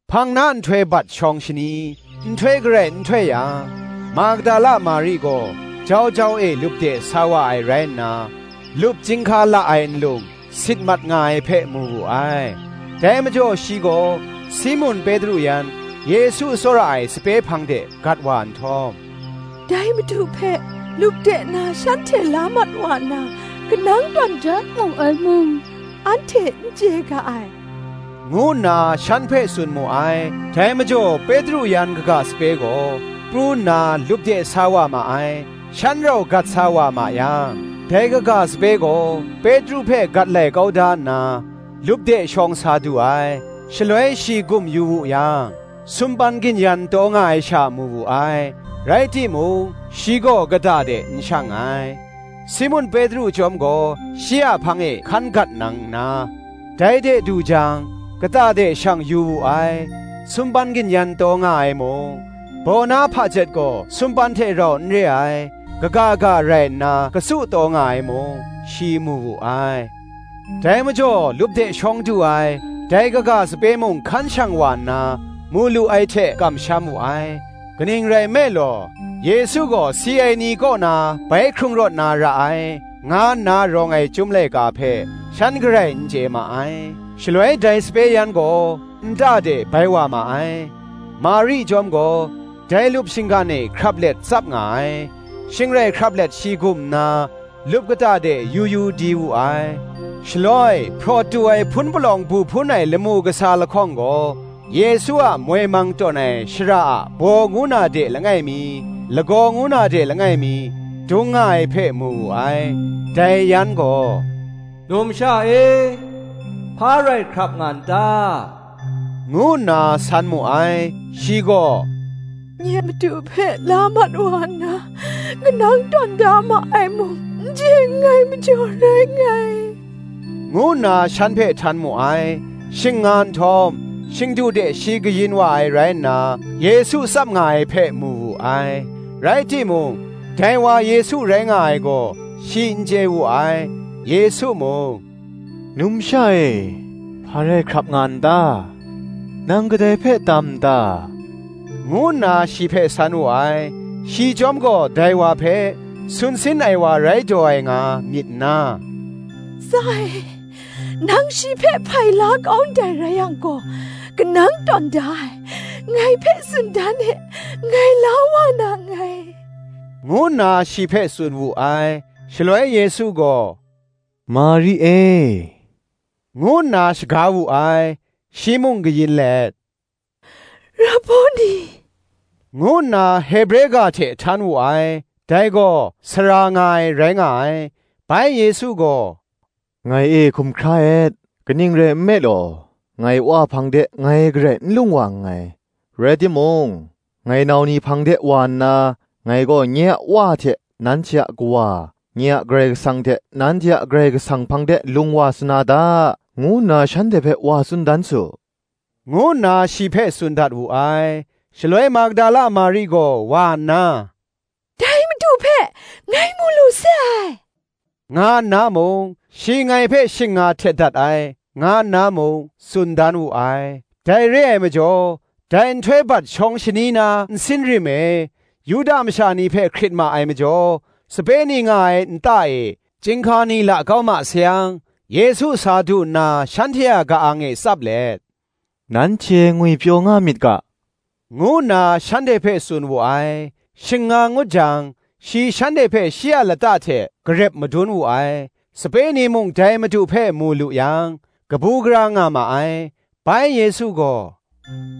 Hpang na nhtoi bat shawng shani, nhtoi garai n htoi yang, Magdala Mari gaw jau jau e lup de sa wa ai rai nna, lup chyinghka la ai nlung sit mat nga ai hpe, mu wu ai. Dai majaw shi gaw Simun Petru yan Yesu tsawra ai sape hpang de gat wa nhtawm, “Dai Madu hpe lup de na shanhte la mat wa nna, kanang tawn da mu ai mung, anhte n chye ga ai,” ngu nna shan hpe tsun mu ai. Dai majaw Petru yan kaga sape gaw, pru nna lup de sa wa ma ai. Shan rau gat sa wa ma yang, dai kaga sape gaw Petru hpe gat lai kau da nna, lup de shawng sa du ai: shaloi shi gum yu wu yang, sumpan gin-yan taw nga ai sha mu wu ai: rai timung, shi gaw kata de n shang ai. Simun Petru chyawm gaw shi a hpang e hkan gat nang nna, dai de du jang, kata de shang yu wu ai: sumpan gin-yan taw nga ai mung, baw na hpajet gaw sumpan hte rau n re ai, kaga ga rai nna katsu taw nga ai mung, shi mu wu ai. Dai majaw lup de shawng du ai, dai kaga sape mung hkan shang wa nna, mu lu ai hte kamsham wu ai. Kaning rai nme law, Yesu gaw si ai ni kaw na bai hkrung rawt na ra ai, nga nna rawng ai Chyum laika hpe, shan garai n chye ma ai. Shaloi dai sape yan gaw nta de bai wa ma ai. Mari chyawm gaw, dai lup shinggan e hkrap let tsap nga ai: shing rai hkrap let shi gum nna, lup kata de yu yu di wu ai; shaloi hpraw tu ai hpun palawng bu hpun ai lamu kasa lahkawng gaw, Yesu a moi mang tawn ai shara a baw ngu na de langai mi, lagaw ngu na de langai mi, dung nga ai hpe mu wu ai. Dai yan gaw, “Numsha e, hpa rai hkrap nga n ta?” ngu nna san mu ai: shi gaw, “Nye Madu hpe la mat wa nna, kanang tawn da ma ai mung, n chye nngai majaw rai nngai,” ngu nna shan hpe htan mu ai. Shing nga nhtawm, shingdu de shi kayin wa ai rai nna, Yesu tsap nga ai hpe mu wu ai; rai timung, dai wa Yesu rai nga ai gaw, shi n chye wu ai. Yesu mung, “Numsha e, hpa rai hkrap nga n ta? nang kadai hpe tam n ta?” ngu nna shi hpe san wu ai: shi chyawm gaw dai wa hpe sun sin ai wa rai daw ai nga, myit nna, “Tsa e, nang shi hpe hpai la kau ndai rai yang gaw, kanang tawn da ai, ngai hpe tsun dan e, ngai la wa na nngai,” ngu nna shi hpe tsun wu ai. Shaloi Yesu gaw, “Mari e,” ngu nna shaga wu ai. Shi mung kayin let, “Raboni,” ngu nna Hebre ga hte htan wu ai: dai gaw, Sara nga ai, rai nga ai. Bai Yesu gaw, “Ngai e hkum hkra et; kaning rai nme law, ngai Wa hpang de ngai garai n lung wa nngai: rai timung, ngai nau ni hpang de wa nna, Ngai gaw nye a Wa hte nanhte a Kawa, nye a Karai Kasang hte nanhte a Karai Kasang hpang de lung wa sa na da, ngu nna shanhte hpe wa tsun dan su,” ngu nna shi hpe tsun dat wu ai. Shaloi Magdala Mari gaw wa nna, “Dai Madu hpe ngai mu lu se ai,” nga nna mung, shi ngai hpe shing nga htet dat ai, nga nna mung, tsun dan wu ai. Dai re ai majaw, dai nhtoi bat shawng shani na nsin rim e, Yuda masha ni hpe hkrit ma ai majaw, sape ni nga ai nta e chyinghka ni la kau ma sayang, Yesu sa du nna shanhte a ka-ang e tsap let, “Nanhte ngwipyaw nga myit ga,” ngu nna shanhte hpe tsun wu ai. Shing nga ngut jang, shi shanhte hpe shi a lata hte garep madun wu ai. Sape ni mung dai Madu hpe mu lu yang, kabu gara nga ma ai. Bai Yesu gaw,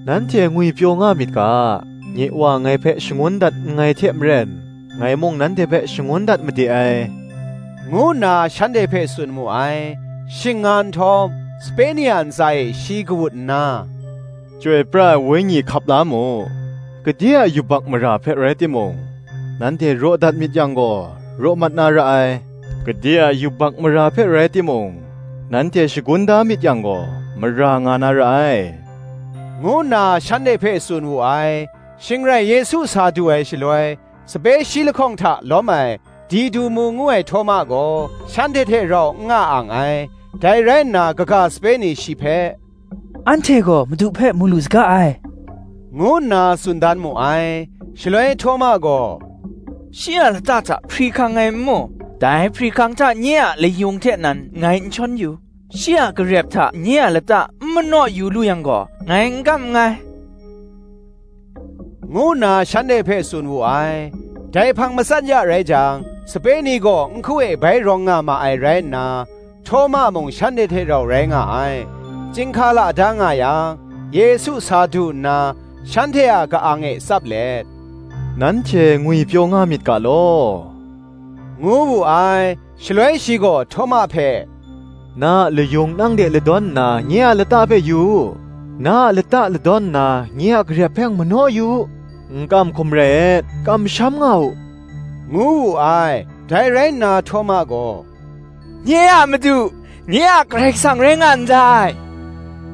“Nanhte ngwipyaw nga myit ga; nye Wa ngai hpe shangun dat nngai hte maren, ngai mung nanhte hpe shangun dat made ai,” ngu nna shanhte hpe tsun mu ai. Shing nga nhtawm, sape ni a ntsa e shi kawut nna, “Chyoi pra ai Wenyi hkap la mu: gade a yubak mara hpe rai timung, nanhte raw dat myit yang gaw, raw mat na ra ai; gade a yubak mara hpe rai timung, nanhte shagun da myit yang gaw, mara nga na ra ai,” ngu nna shanhte hpe tsun wu ai. Shing rai Yesu sa du ai shaloi, sape shi lahkawng hta lawm ai Didumu ngu ai Htawma gaw, shanhte hte rau n nga ang ai. Dai rai nna kaga sape ni shi hpe, “Anhte gaw Madu hpe mu lu saga ai,” ngu nna tsun dan mu ai. Shaloi Htawma gaw, “Shi a lata hta hpri hkang ngai n mu, dai hpri hkang hta nye a layung hte nan ngai n shawn yu, shi a garep hta nye a lata n manaw yu lu yang gaw, ngai n kam nngai,” ngu nna shanhte hpe tsun wu ai. Dai hpang matsat ya rai jang, sape ni gaw nhku e bai rawng nga ma ai rai nna, Htawma mung shanhte hte rau rai nga ai. Chyinghka la da nga yang, Yesu sa du nna shanhte a ka-ang e tsap let, “Nanhte ngwipyaw nga myit ga law,” ngu wu ai. Shaloi shi gaw Htawma hpe, “Na a layung nang de ladawn nna, nye a lata hpe yu u; na a lata ladawn nna, nye a garep hpe mung manaw yu u; n kam hkum rai et, kamsham nga u,” ngu wu ai. Dai rai nna Htawma gaw, “Nye a Madu, nye a Karai Kasang rai nga ndai,”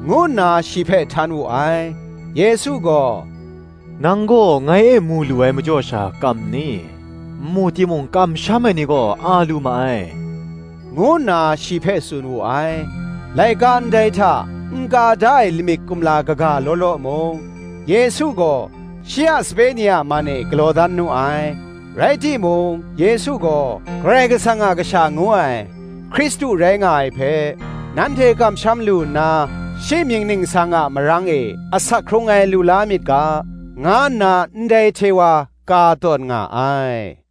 ngu nna shi hpe htan wu ai. Yesu gaw, “Nang gaw ngai e mu lu ai majaw sha kam nni? n mu timung, kamsham ai ni gaw a lu ma ai,” ngu nna shi hpe tsun wu ai. Laika ndai hta n ka da ai lamik kumla kaga law law mung, Yesu gaw shi a sape ni a man e galaw dan nu ai: rai timung, Yesu gaw, Karai Kasang a Kasha ngu ai, Hkristu rai nga ai hpe, nanhte kamsham lu nna, shi mying ningsang a marang e asak hkrung ai lu la myit ga, nga nna ndai hte wa ka tawn nga ai.